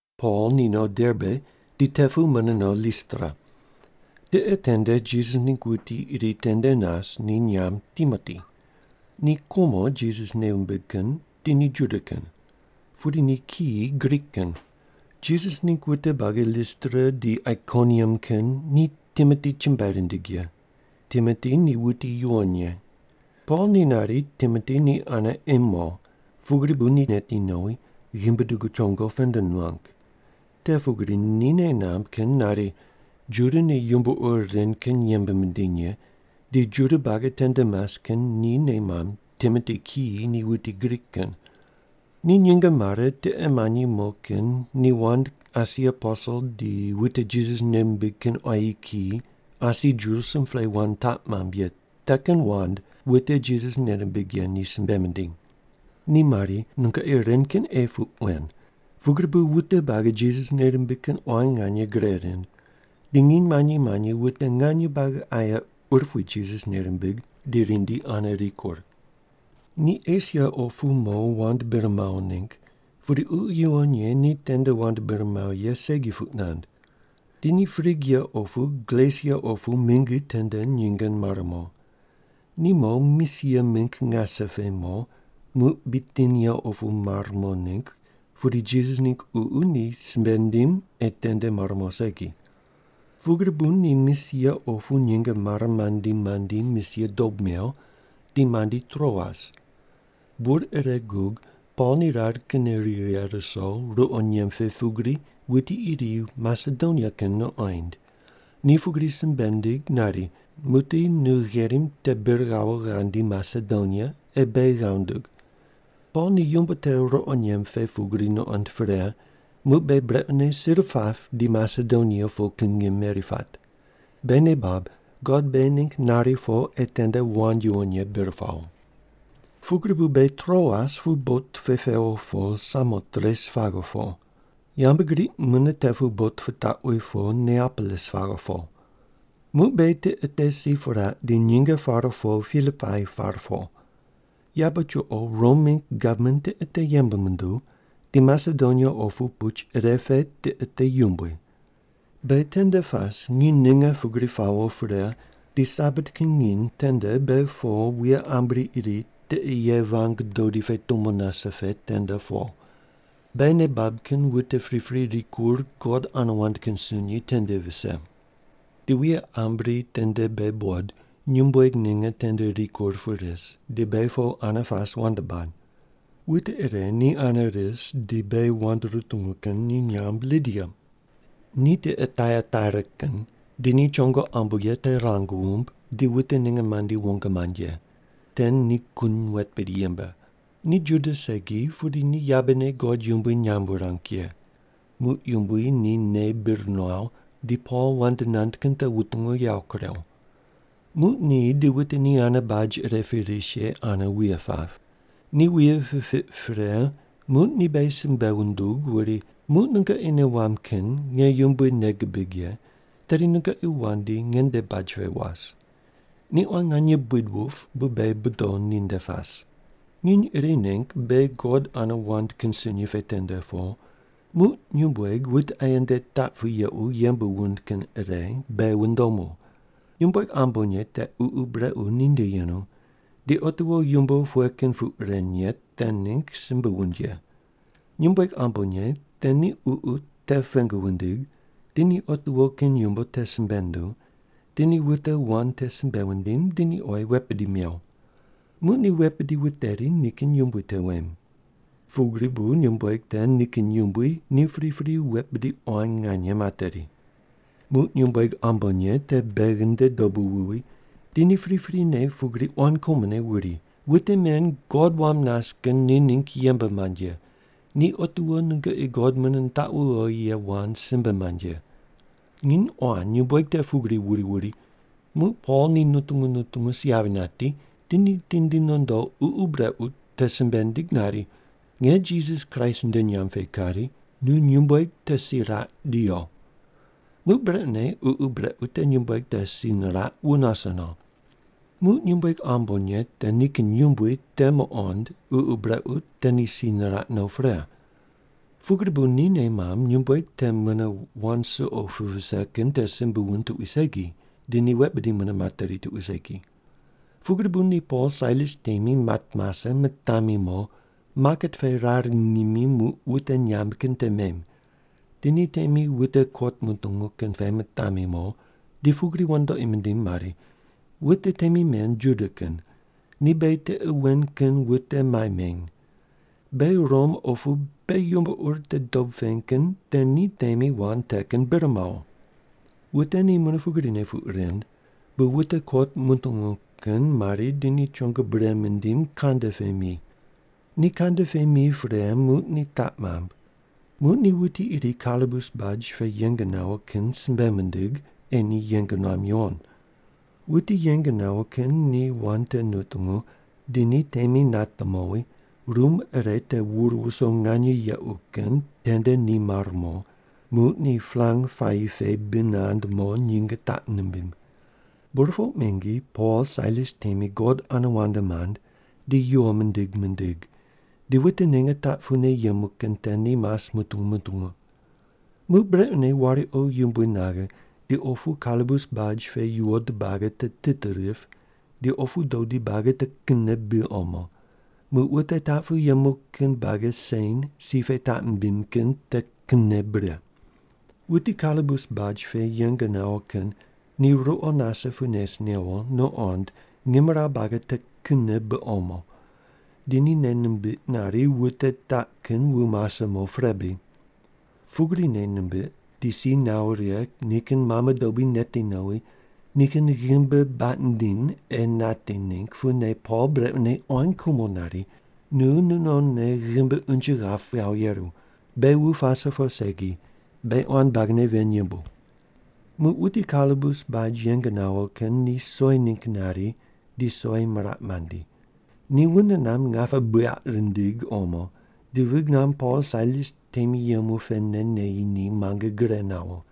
Pol ni no Derbe di te pu mune no Listra. Tiqe tende Jisas ningg wuti iri tende nas, ni nyamb Timoti. Ni kumo Jisas nei wumbig kin, di ni Juda kin. Pudi ni kiyi Grik kin. Jisas ningg wute buagi Listra di Aikoniam kin ni Timoti chumbuai rindig ye. Timoti ni wuti yuwon ye. Pol ni nari Timoti ni ane ei mo, pugri bu ni neti nowi, ghimbi dugu chongo pend nuang. Te pugri ni nei namb kin nari, Juda ni yumbo ur ren kin yembe mindiny ye, di Juda buagi tende mas kin ni nei mamb Timoti kiyi ni wuti Grik kin. Ni nyinge mare, tiqe manyi mo kin ni wand asi aposel di wute Jisas nei mimbig kin quayi kiyi asi Jerusalem pe wand taq mamb ye te kin wand wute Jisas nei rimbig ye ni simbe mindiny. Ni mari, “Nungoqi ren kin ei puq wen.” Pugri bu wute buagi Jisas nei rimbig kin quan nganye gre rind, di nginy manyi manyi wute nganye buagi aye urupui Jisas nei rimbig di rindi ane rikur. Ni Esia opu mo wand bir mawo ningg, pudi Ququ Yuwon Ye ni tende wand bir mawo ye segi puq nand. Di ni Prigia opu Galesia opu mingi tende nyinge mare mo. Ni mo, Misia mingg ngase pe mo, muq Bitinia opu mar mo ningg, pudi Jisas ningg Ququ ni simbe nindim ei tende mar mo segi. Pugri bu ni Misia opu nyinge mare mandi mandi Misia dob mew di mandi Troas. Bur ire gug Pol ni rar kinne ri righe ruso ruqo nyemb pe pugri wuti iri Masedonia kin nuqoind, ni pugri simbe nindig nari, “Muqdi nu gherim te bir ghawo ghandi Masedonia, ei beghi ghav ndug.” Pol ni yumbo te ruqo nyemb pe pugri nuqond pre, muq beghi brequne sir pap di Masedonia po kin ngim meri pat. Beghi nei bab, God beghi ningg nari po ei tende wand yuwon ye bir pawo. Pugri bu beghi Troas pu bot pe pewo po Samotres paghe po. Yambgriq mune te pu bot pitaqwi po Neapolis paghe po. Muq beghi tiqe te si piraq, di nyinge pare po Pilipai par po. Yabe chuqo Rom mingg gavman tiqe te yembe munduw, di Masedonia opu puch ire pe tiqe te yumbui. Beghi tende pas, nginy ninge pugri pawo pre, di Sabat kin nginy tende beghi po wuye ambri iri tiqe ye vang dodi pe tumo nase pe tende po. Beghi nei bab kin wute pripri rikur God ane wand kin sunyi tende vise. Di wuye ambri tende beghi buqod, nyumbueg ninge tende rikur pu ris di beghi po ane pas wand bad. Wute ire ni ane ris di beghi wand rutungu kin ni nyamb Lidia. Ni tiqe Taiataira kin, di ni chongo ambo ye te rang wumb, di wute ninge mandi wong mand ye. Te ni kun wet bidi yembe. Ni Juda segi pudi ni yabene God yumbui nyamb wurang ye. Muq Yumbui ni nei bir nuaw, di Pol wand nand kin te wutungu yawo kurew. Muq ni di wute ni ane baj ire pe ris ye ane wuye pap. Ni wuye pipiq pre muq ni beghi simbe wundug wuri, “Muq nungoqi nei wamb kin nge Yumbui nei gibig ye, tedi nungoqi wandi nge nde baj pe was.” Ni quan nganye buid wup bu beghi bodo ninde pas. Nginy iri ningg beghi God ane wand kin sunyi pe tende po, muq nyumbueg wute aye nde taq pu yequ yembe wund kin ire beghi wundomu. Nyumbueg ambonye te ququ brequ ninde yenu, di otiwo yumbo pughe kin puq ren ye te ningg simbe wund ye. Nyumbueg ambonye te ni ququ te pengu wundig, di ni otiwo kin yumbo te simbe nunduw, di ni wute wand te simbe wundim, di ni oyi wet bidi mew. Muq ni wet bidi wuteri nikin yumbui te wem. Pugri bu nyumbueg te nikin yumbui ni pripri wet bidi quan nganye materi. Muq nyumbueg ambonye te beghi nde dobu wuwi, di ni priprine pugri quan kumone wuri, “Wute men God wam nas kin ni ningg yembe mand ye. Ni otiwo nungoqi God mune nitaqu wowi ye wand simbe mand ye.” Nginy quan nyumbueg te pugri wuri wuri, muq Pol ni nutungu nutungu si yavi nati, di ni tindi nondo ququ brequ te simbe nindig nari, “Nge Jisas Kraist nde nyamb pe kari, nu nyumbueg te si raq di yo.” Muq brequne ququ brequ te nyumbueg te si niraq, wu nase no. Muq nyumbueg ambonye te nikin yumbui te muqond ququ brequ te ni si niraq no pre. Pugri bu ni nei mamb nyumbueg te mune wand suqo pu vise kin te simbe wund tuqui segi, di ni wet bidi mune materi tuqui segi. Pugri bu ni Pol Sailas temi mat mase, mitami mo, maket pe rar ngimi muq wute nyamb kin te mem. Di ni temi wute kot mutungu kin pe mitami mo di pugri wandoqi mindim mari, “Wute temi men Juda kin. Ni beghi tiqe wen kin wute mai meny. Beghi Rom opu beghi yumbo ur te dob peny kin te ni temi wand te kin bir mawo.” Wute ni mune pugrine puq rind, bu wute kot mutungu kin mari di ni chongo bure mindim, kande pe mi. Ni kande pe mi pre, muq ni taq mamb. Muq ni wuti iri kalabus baj pe yeng nawo kin simbe mindig, ei ni yeng nuam yuwon. Wuti yeng nawo kin ni wand te nutungu, di ni temi nate mowi, rum ire te wur wuso nganye yequ kin tende ni mar mo, muq ni palang puayi pe bi nand mo, nyinge taq nimbim. Burpoq mingi Pol Sailas temi God ane wand mand di yuwo mindig mindig, di wute ninge taq pune yemu kin te ni mas mutungu mutungu. Muq brequne wariqo yumbui naghe di opu kalabus baj pe yuwod buagi te tit rip, di opu dodi buagi te kinne bi omo, muq wute taq pu yemu kin buagi sen si pe taq mimbim kin te kinne bure. Wuti kalabus baj pe yeng nawo kin ni ruqo nase pu nes newo nuqond ngimrawu buagi te kinne bi omo, di ni nei nimbiq nari wute taq kin wu mase mo pre bri. Pugri nei nimbiq di si nawo righe nikin mame dobui neti nowi nikin ghimbi baq nindiny ei nati ningg pune Pol brequne quan kumone nari, “Nu nu nonne ghimbi unje ghap ghawo yeru. Beghi wu pase po segi. Beghi quan buagine ven yembu!” Muq wuti kalabus baj yeng nawo kin ni soi ningg nari di soi miraq mandi. Ni wune namb ngape buyaq rindig omo, di vig namb Pol Sailas temi yemu pene neyi ni muange gure nawo.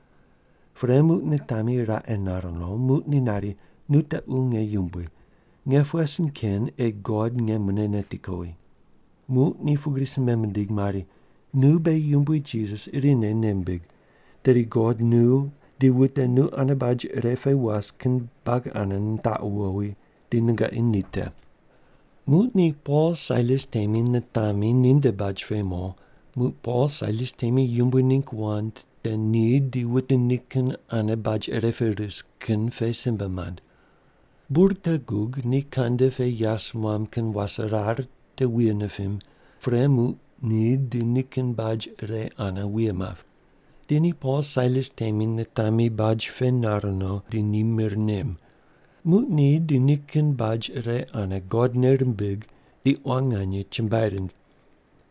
Pre muq nitami raqe nar no, muq ni nari, “Nu tequ nge yumbui. Nge pughe sin ken ei God nge mune neti kowi?” Muq ni pugri simbe mindig mari, “Nu beghi Yumbui Jisas irine nei mbig, tedi God nu di wute nu ane baj ire pe was kin buagi ane nitaqu wowi, di nungoqi ni te.” Muq ni Pol Sailas temi nitami ninde baj pe mo, muq Pol Sailas temi Yumbui ningg wand te ni di wute nikin ane baj ire pe ris kin pe simbe mand. Bur te gug ni kande pe yas muam kin waserar te wuye nipim, pre muq ni di nikin baj ire ane wuye map. Di ni Pol Sailas temi nitami baj pe nar no, di ni mir nem. Muq ni di nikin baj ire ane God nei rimbig di quan nganye chumbuai rind.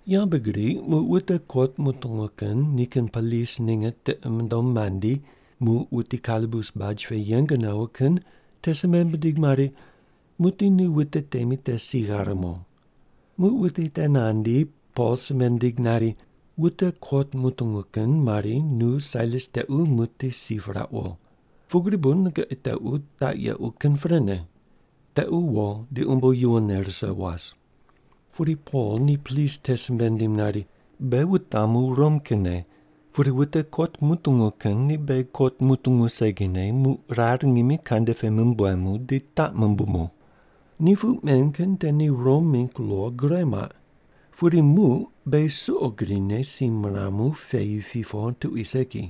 Yambgriq muq wute kot mutungu kin nikin polis ninge tiqi mundom mandi, muq wuti kalabus baj pe yeng nawo kin ni simbe mindig mari, “Muqdi nu wute temi te si ghare mo.” Muq wuti te nandi, Pol simbe nindig nari, “Wute kot mutungu kin mari, nu Sailas tequ muqdi si pirauq wo. Pugri bu nungoqi tequ taq yequ kin prene. Tequ wo di umbo yuwonne rise was.” Pudi Pol ni polis te simbe nindim nari, “Beghi wutamu Rom kinne, pudi wute kot mutungu kin ni beghi kot mutungu segine muq rar ngimi kande pe mumbuemu di taq mumbumu. Ni puq men kin te ni Rom mingg lo gure muaq. Pudi muq beghi suqo grine si miramu peyi pi po tuqui segi.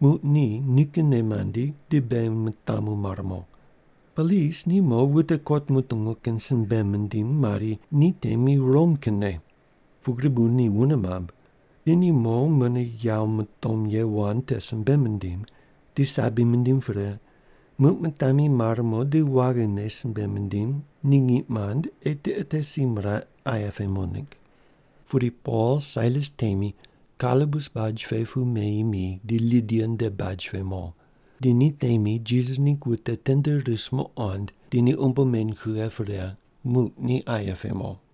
Muq ni nikinne mandi di beghi mitamu mar mo.” Polis ni mo wute kot mutungu kin simbe mindim mari, “Ni temi Rom kinne.” Pugri bu ni wune mamb. Di ni mo mune yawo mutom ye wand te simbe mindim, di sabi mindim pre, muq mitami mar mo di waghine simbe mindim ni ngiq mand ei tiqe te si miraq aye pe mo ningg. Pudi Pol Sailas temi kalabus baj pe pu meyi mi di Lidia nde baj pe mo. Di ni temi Jisas ningg wute tende ris muqond, di ni umbo meny kughe pre, muq ni aye pe mo.